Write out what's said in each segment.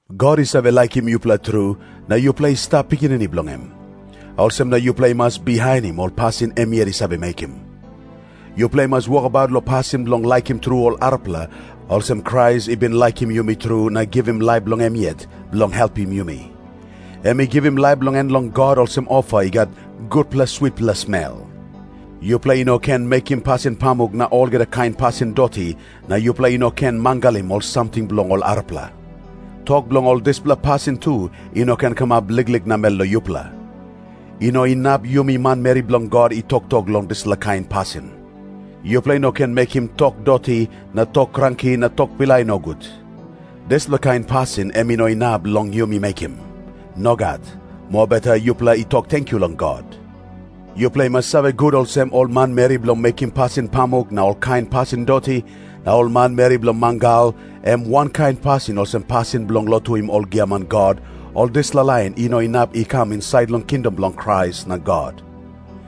God i save laikim yupela tru, na yupela i stap pikinini bilong em. Olsem na yupela i mas bihainim ol pasin em yet i save mekim. Yupela i mas wokabaut long pasin bilong laikim tru ol arapela, olsem Krais i bin laikim yumi tru na givim laip bilong em yet bilong helpim yumi. Em i givim laip bilong en long God olsem ofa i gat gutpela switpela smel. Yupela i no ken mekim pasin pamuk na olgeta kain pasin doti, na yupela i no ken mangalim ol samting bilong ol arapela. Tok bilong ol dispela pasin tu i no ken kamap liklik namel long yupela. I no inap yumi manmeri bilong God i toktok long ol dispela kain pasin. Yupela i no ken mekim tok doti na tok kranki na tok pilai nogut. Dispela kain pasin em i no inap long yumi mekim. Nogat. Mobeta yupela i tok tenkyu long God. Yupela i mas save gut olsem, ol manmeri bilong mekim pasin pamuk na olkain pasin doti, na ol manmeri bilong mangal, em wankain pasin olsem pasin bilong lotuim ol giaman god, ol dispela lain i no inap i kam insait long kingdom bilong Krais na God.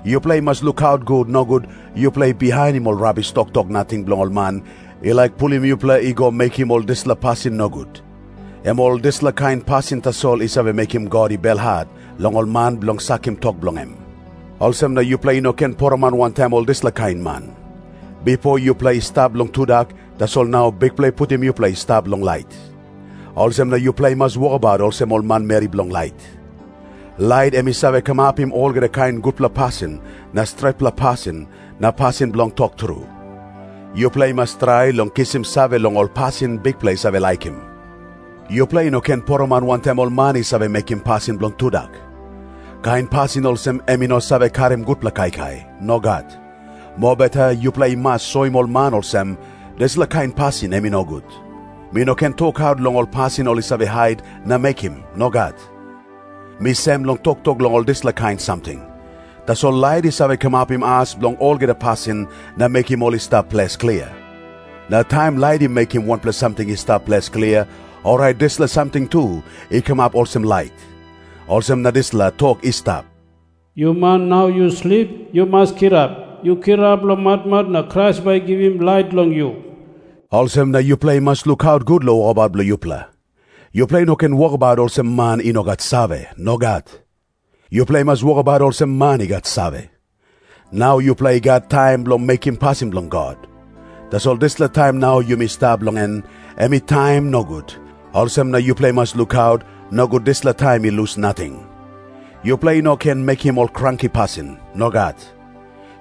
Yupela i mas lukaut gut, nogut yupela i bihainim ol rabis toktok nating bilong ol man i laik pulim yupela i go mekim ol dispela pasin nogut. Em ol dispela kain pasin tasol i save mekim God i belhat long ol man bilong sakim tok bilong em. Olsem na yupela i no ken poroman wantaim ol dispela kain man. Bipo yupela i stap long tudak, tasol nau Bikpela i putim yupela i stap long lait. Olsem na yupela i mas wokabaut olsem ol manmeri bilong lait. Lait em i save kamapim olgeta kain gutpela pasin na stretpela pasin na pasin bilong tok tru. Yupela i mas trai long kisim save long ol pasin Bikpela i save laikim. Yupela i no ken poroman wantaim ol man i save mekim pasin bilong tudak. Kain pasin olsem em i no save karim gutpela kaikai. Nogat. Mobeta yupela i mas soim ol man olsem, dispela kain pasin em i nogut. Mi no ken tokaut long ol pasin ol i save hait na mekim. Nogat. Mi sem long toktok long ol dispela kain samting. Tasol lait i save kamapim as bilong olgeta pasin na mekim ol i stap ples klia. Na taim lait i mekim wanpela samting i stap ples klia, orait dispela samting tu i kamap olsem lait. Olsem na dispela tok i stap, “Yu man nau yu slip, yu mas kirap. Yu kirap long matmat na Krais bai i givim lait long yu.” Olsem na yupela i mas lukaut gut long wokabaut bilong yupela. Yupela i no ken wokabaut olsem man i no gat save. Nogat. Yupela i mas wokabaut olsem man i gat save. Nau yupela i gat taim bilong mekim pasin bilong God. Tasol dispela taim nau yumi stap long en, em i taim nogut, olsem na yupela i mas lukaut, nogut dispela taim i lus nating. Yupela i no ken mekim ol kranki pasin. Nogat.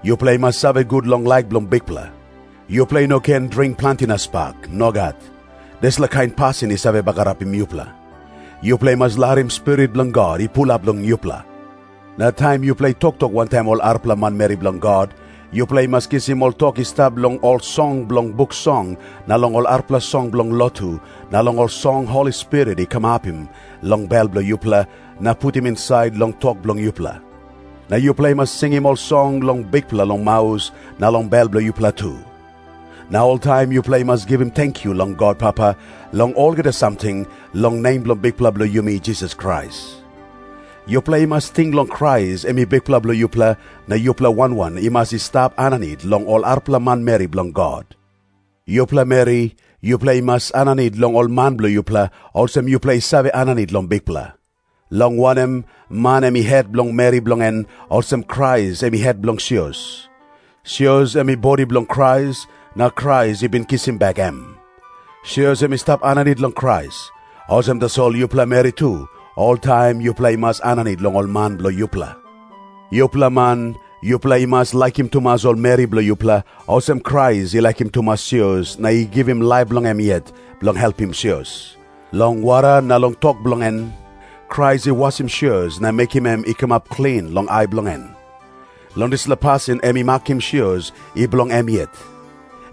Yupela i mas save gut long laik bilong Bikpela. Yupela i no ken dring planti na spak. Nogat. Dispela kain pasin i save bagarapim yupela. Yupela i mas larim Spirit bilong God i pulap long yupela. Na taim yupela i toktok wantaim ol arapela manmeri bilong God, yupela i mas kisim ol tok i stap long ol song bilong Buk Song na long ol arapela song bilong lotu na long ol song Holi Spirit i kamapim long bel bilong yupela, na putim insait long tok bilong yupela. Na yupela i mas singim ol song long Bikpela, long maus na long bel bilong yupela tu. Na oltaim yupela i mas givim tenkyu long God Papa long olgeta samting, long nem bilong Bikpela bilong yumi Jisas Krais. Yupela i mas ting long Krais em i Bikpela bilong yupela, na yupela wan wan i mas i stap aninit long ol arapela manmeri bilong God. Yupela meri, yupela i mas aninit long ol man bilong yupela, olsem yupela i save aninit long Bikpela. Long wanem, man em i het bilong meri bilong en, olsem Krais em i het bilong sios. Sios em i bodi bilong Krais, na Krais i bin kisim bek em. Sios em i stap aninit long Krais. Olsem tasol yupela meri tu, oltaim yupela i mas aninit long ol man bilong yupela. Yupela man, yupela i mas laikim tumas ol meri bilong yupela, olsem Krais i laikim tumas sios na i givim laip bilong em yet bilong helpim sios. Long wara na long tok bilong en, Krais i wasim sios na mekim em i kamap klin long ai bilong en. Long dispela pasin em i makim sios i bilong em yet.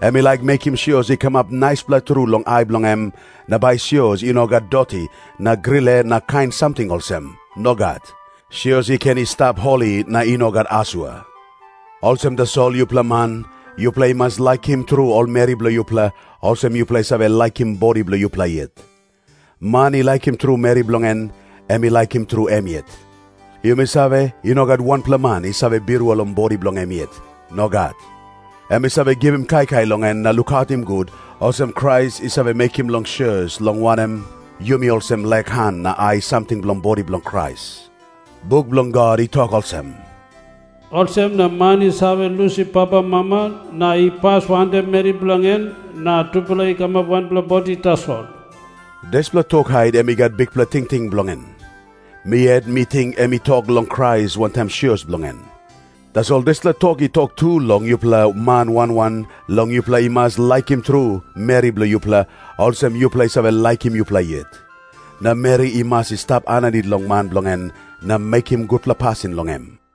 Em i laik mekim sios i kamap naispela tru long ai bilong em, na bai sios i no gat doti na grile na kain samting olsem. Nogat. Sios i ken i stap holi na i no gat asua. Olsem tasol yupela man, yupela i mas laikim tru ol meri bilong yupela, olsem yupela i save laikim bodi bilong yupela yet. Man i laikim tru meri bilong en, em i laikim tru em yet. Yumi save, i no gat wanpela man i save birua long bodi bilong em yet. Nogat. Em i save givim kaikai long en na lukautim gut, olsem Krais i save mekim long sios, long wanem, yumi olsem lek han na ai samting bilong bodi bilong Krais. Buk bilong God i tok olsem, “Olsem na man i save lusim papamama na i pas wantaim meri bilong en, na tupela i kamap wanpela bodi tasol.” Dispela tok hait em i gat bikpela tingting bilong en. Mi yet, mi ting em i tok long Krais wantaim sios bilong en. Tasol dispela tok i tok tu long yupela man wan wan long yupela i mas laikim tru meri bilong yupela, olsem yupela i save laikim yupela yet. Na meri i mas i stap aninit long man bilong en na mekim gutpela pasin long em.